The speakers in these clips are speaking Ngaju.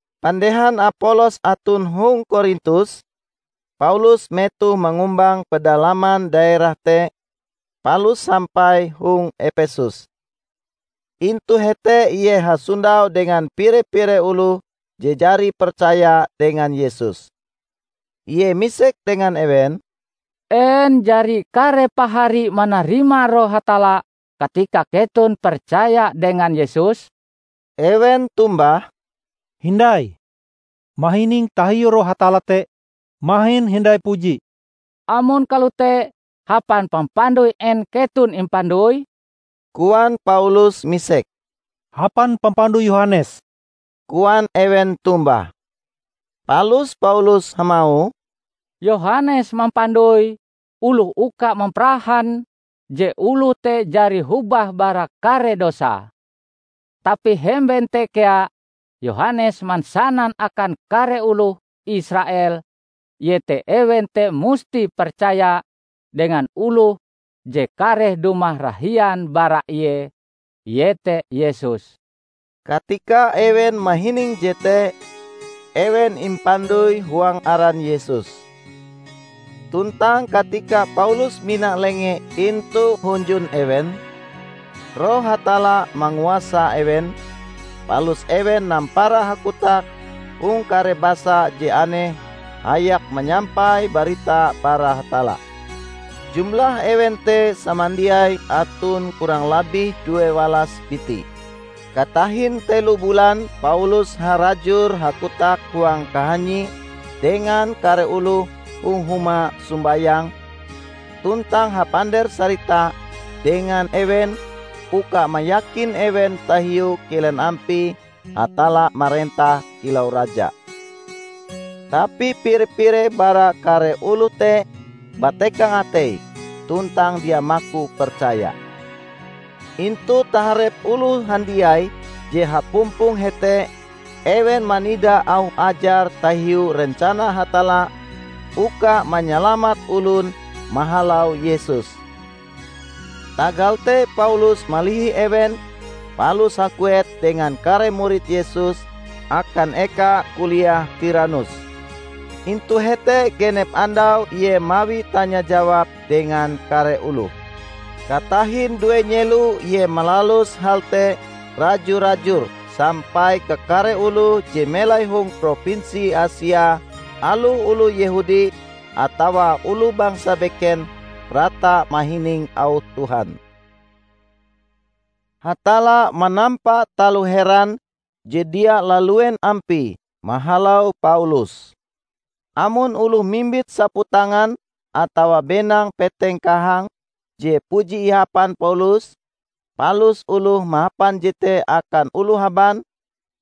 Pandehan Apolos aton hong Korintus, Paulus metohe mangumbang pedalaman daerah te palus sampai hong Epesus. Intu hete ie hasondau dengan pire-pire oloh je jari percaya dengan Yesus. Ie misek dengan ewen, "En jari kare pahari manarima Roh Hatalla katika keton percaya dengan Yesus?" Ewen tombah, "Hindai. Mahining tahiu Roh Hatalla te mahin hindai puji." "Amon kalote, hapan pampandoi en keton impandoi?" koan Paulus misek. "Hapan pampandoi Yohanes," koan ewen tombah. Palus Paulus hamauh, "Yohanes mampandoi oloh uka mamparahan je oloh te jari hobah bara kare dosae. Tapi hemben te kea Yohanes mansanan akan kare oloh Israel iete ewen te musti percaya dengan oloh je kareh dumah rahian bara ie, ie te Yesus." Katika ewen mahining jete, ewen impandoi huang aran Yesus. Tuntang katika Paulus mina lengee intu hunjun ewen, Roh Hatalla manguasa ewen, palus ewen nampara hakotak hong kare basa je aneh hayak manyampai barita bara Hatalla. Jumlah ewen te samandiai aton kurang labih due walas biti. Katahin telo bulan Paulus harajur hakotak huang kahanyie dengan kare oloh hong huma sombayang tuntang hapander-sarita dengan ewen uka mayakin ewen tahiu kilen ampie Hatalla marentah kilau Raja. Tapi pire-pire bara kare oloh te batekang ateie tuntang dia maku percaya. Intu taharep oloh handiai je hapumpong hete ewen manida auh ajar tahiu rencana Hatalla uka manyalamat olon mahalau Yesus. Tagal te Paulus malihi ewen palus haguet dengan kare murid Yesus akan eka kuliah Tiranus. Intu hete genep andau ie mawi tanya-jawab dengan kare oloh. Katahin due nyelo ie malalus hal te raju-rajur sampai kakare oloh je melai hong propinsi Asia, aloh oloh Yehudi atawa oloh bangsa beken, rata mahining auh Tuhan. Hatalla manampa taloh heran je dia laluen ampie mahalau Paulus. Amon oloh mimbit saputangan atawa benang peteng kahang je puji ihapan Paulus palus oloh mahapan jete akan oloh haban,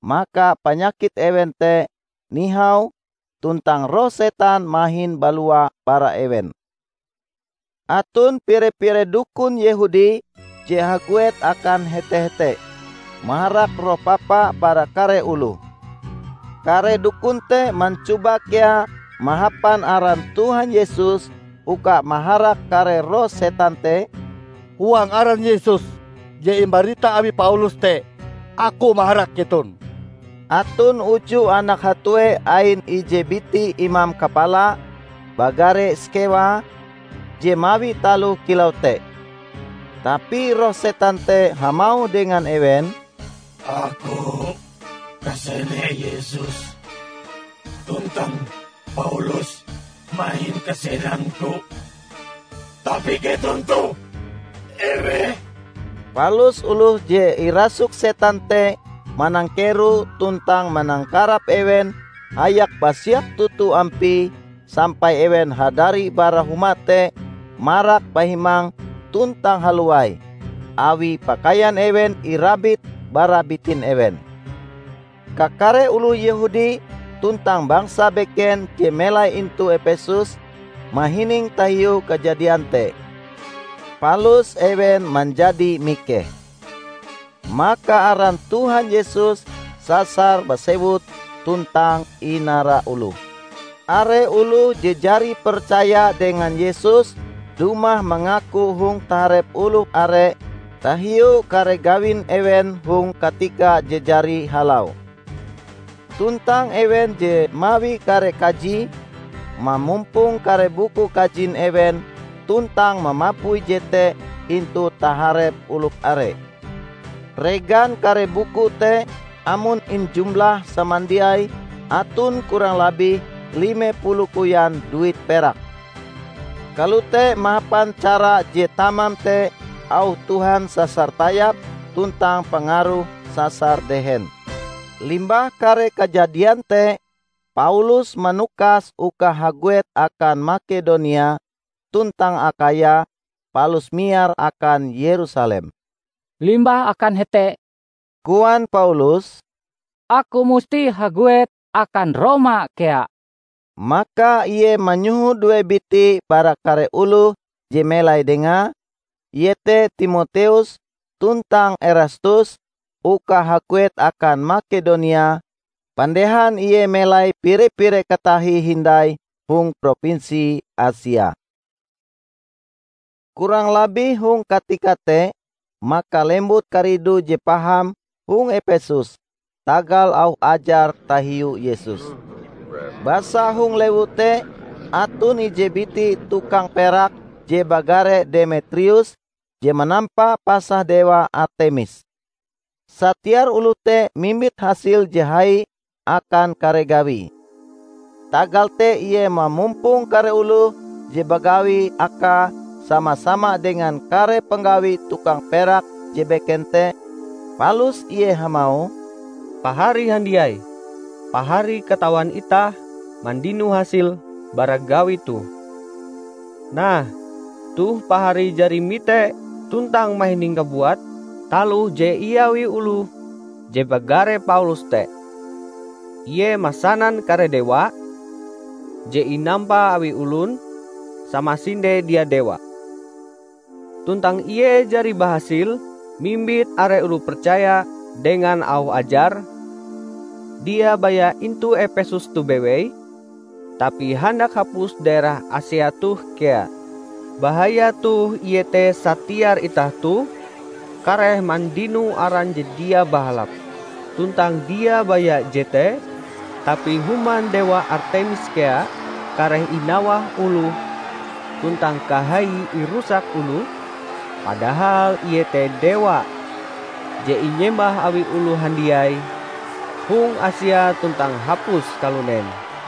maka panyakit ewen te nihau tuntang roh setan mahin balua bara ewen. Aton pire-pire dukun Yehudi je haguet akan hete-hete, maharak roh papa bara kare oloh. Kare dukun te mancoba kea mahapan aran Tuhan Yesus uka maharak kare roh setan te, "Huang aran Yesus je imbarita awi Paulus te, aku maharak keton!" Aton uju anak hatue ain ije biti imam kapala, bagare Skewa, je mawi taloh kilau te. Tapi roh setan te hamauh dengan ewen, "Aku kasene Yesus tuntang Paulus mahin kasenangku, tapi keton toh eweh?" Palus oloh je irasuk setan te manangkero tuntang manangkarap ewen hayak basiak toto ampie sampai ewen hadari bara huma te marak bahimang tuntang halowai, awi pakaian ewen irabit bara bitin ewen. Kakare oloh Yehudi tuntang bangsa beken je melai intu Epesus mahining tahiu kajadian te, palus ewen manjadi mikeh. Maka aran Tuhan Yesus sasar basewut tuntang inara oloh. Are oloh je jari percaya dengan Yesus dumah mangaku hong taharep oloh are tahiu kare gawin ewen hong katika je jari halau. Tuntang ewen je mawi kare kaji, mamumpong kare buku kajin ewen tuntang mamapui jete intu taharep oloh are. Regan kare buku te amon injumlah samandiaie aton kurang labih lime puluh koyan duit perak. Kalote mahapan cara je tamam te auh Tuhan sasar tayap tuntang pangaruhe sasar dehen. Limbah kare kajadian te, Paulus manukas uka haguet akan Makedonia tuntang Akhaya palus miar akan Yerusalem. "Limbah akan hete," koan Paulus, "aku musti haguet akan Roma kea." Maka ie manyoho due biti bara kare oloh je melai dengae, ie te Timoteus tuntang Erastus uka haguet akan Makedonia pandehan ie melai pire-pire katahie hindai hong propinsi Asia. Kurang labih hong katika te maka lembut karidu je paham hong Epesus tagal auh ajar tahiu Yesus. Basa hong lewu te aton ije biti tukang perak je bagare Demetrius je manampa pasah dewa Artemis. Satiar oloh te mimbit hasil je hai akan kare gawie. Tagal te ie mamumpong kare oloh je bagawi akae sama-sama dengan kare panggawi tukang perak je beken te, palus ie hamauh, "Pahari handiai! Pahari katawan itah mandino hasil bara gawi toh. Nah, toh pahari jari mite tuntang mahining kabuat taloh je iawi oloh je bagare Paulus te. Ie mansanan kare dewa je inampa awi olon, samasinde dia dewa. Tuntang ie jari bahasil mimbit are oloh percaya dengan auh ajare, dia baya intu Epesus toh bewei, tapi handak hapus daerah Asia toh kea. Bahayae toh iete satiar itah toh kareh mandino aran je dia bahalap. Tuntang dia baya jete, tapi human dewa Artemis kea kareh inawah oloh tuntang kahaie irusak oloh; padahal ie te dewa je inyembah awi oloh handiai hong Asia tuntang hapus kalunen!"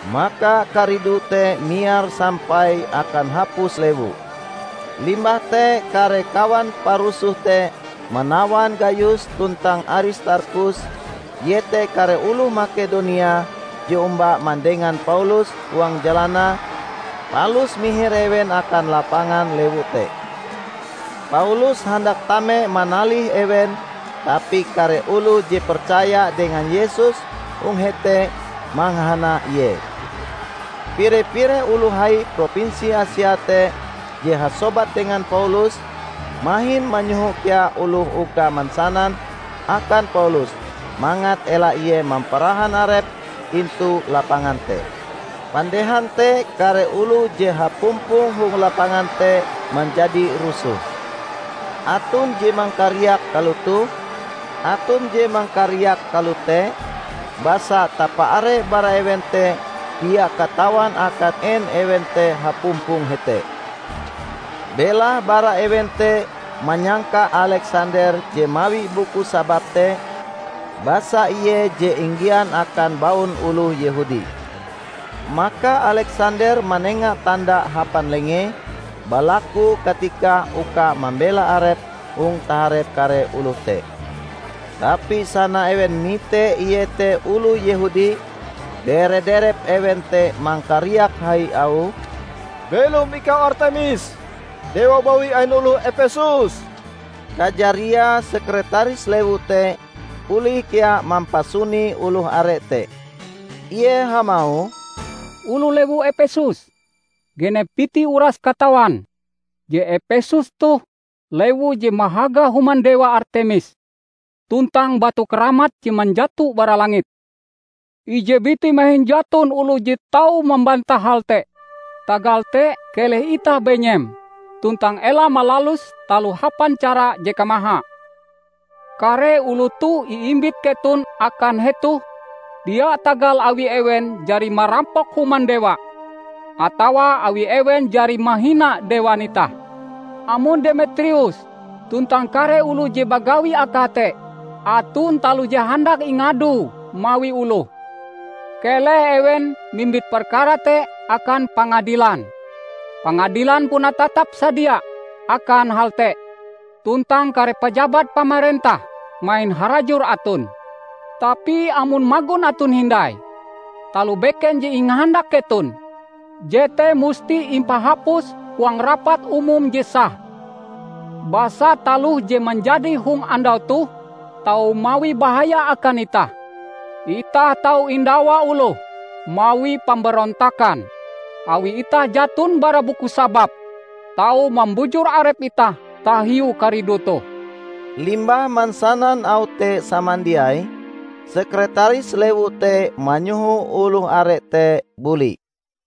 Maka karidu te miar sampai akan hapus lewu. Limbah te kare kawan parusoh te manawan Gayus tuntang Aristarkhus, iete kare oloh Makedonia je omba mandengan Paulus huang jalanae, palus mihir ewen akan lapangan lewu te. Paulus handak tame manalih ewen tapi kare oloh je percaya dengan Yesus hong hete mangahana ie. Pire-pire oloh hai propinsi Asia te je hasobat dengan Paulus, mahin manyoho kea oloh uka mansanan akan Paulus mangat ela ie mamparahan arepe intu lapangan te. Pandehan te kare oloh je hapumpong hong lapangan te manjadi rusoh. Aton je mangkariak kalotoh, aton je mangkariak kalote, basa tapa-are bara ewen te dia katawan akan en ewen te hapumpong hete. Belahe bara ewen te manyangka Aleksander je mawi buku sabab te, basa ie je inggian akan baun oloh Yehudi. Maka Aleksander manenga tanda hapan lengee balaku katika uka mambela arepe hong taharep kare oloh te. Tapi sana ewen mite ie te oloh Yehudi, dere-derep ewen te mangkariak hai auhe, "Belom ikau Artemis, dewa bawi ain oloh Epesus!" Kajariae sekretaris lewu te olih kea mampasuni oloh are te. Ie hamauh, "Oloh lewu Epesus! Genep biti uras katawan je Epesus toh lewu je mahaga human dewa Artemis tuntang batu keramat je manjato bara langit. Ije biti mahin jaton oloh je tau mambantah hal te. Tagal te keleh itah benyem tuntang ela malalus taloh hapan cara je kamaha. Kare oloh toh iimbit keton akan hetoh dia tagal awi ewen jari marampok human dewa atawa awi ewen jari mahina dewan itah. Amon Demetrius tuntang kare oloh je bagawi akae te aton taloh je handak ingadoe mawi oloh, keleh ewen mimbit perkara te akan pangadilan. Pangadilan puna tatap-sadia akan hal te tuntang kare pajabat pamarentah mahin harajur aton. Tapi amon magon aton hindai taloh beken je ingahandak keton, jete musti impahapus huang rapat umum je sah. Basa taloh je manjadi hong andau toh tau mawi bahaya akan itah. Itah tau indawa oloh mawi pamberontakan, awi itah jaton bara buku sabab tau mambujur arep itah tahiu karidu toh." Limbah mansanan auh te samandiai, sekretaris lewu te manyoho oloh are te buli.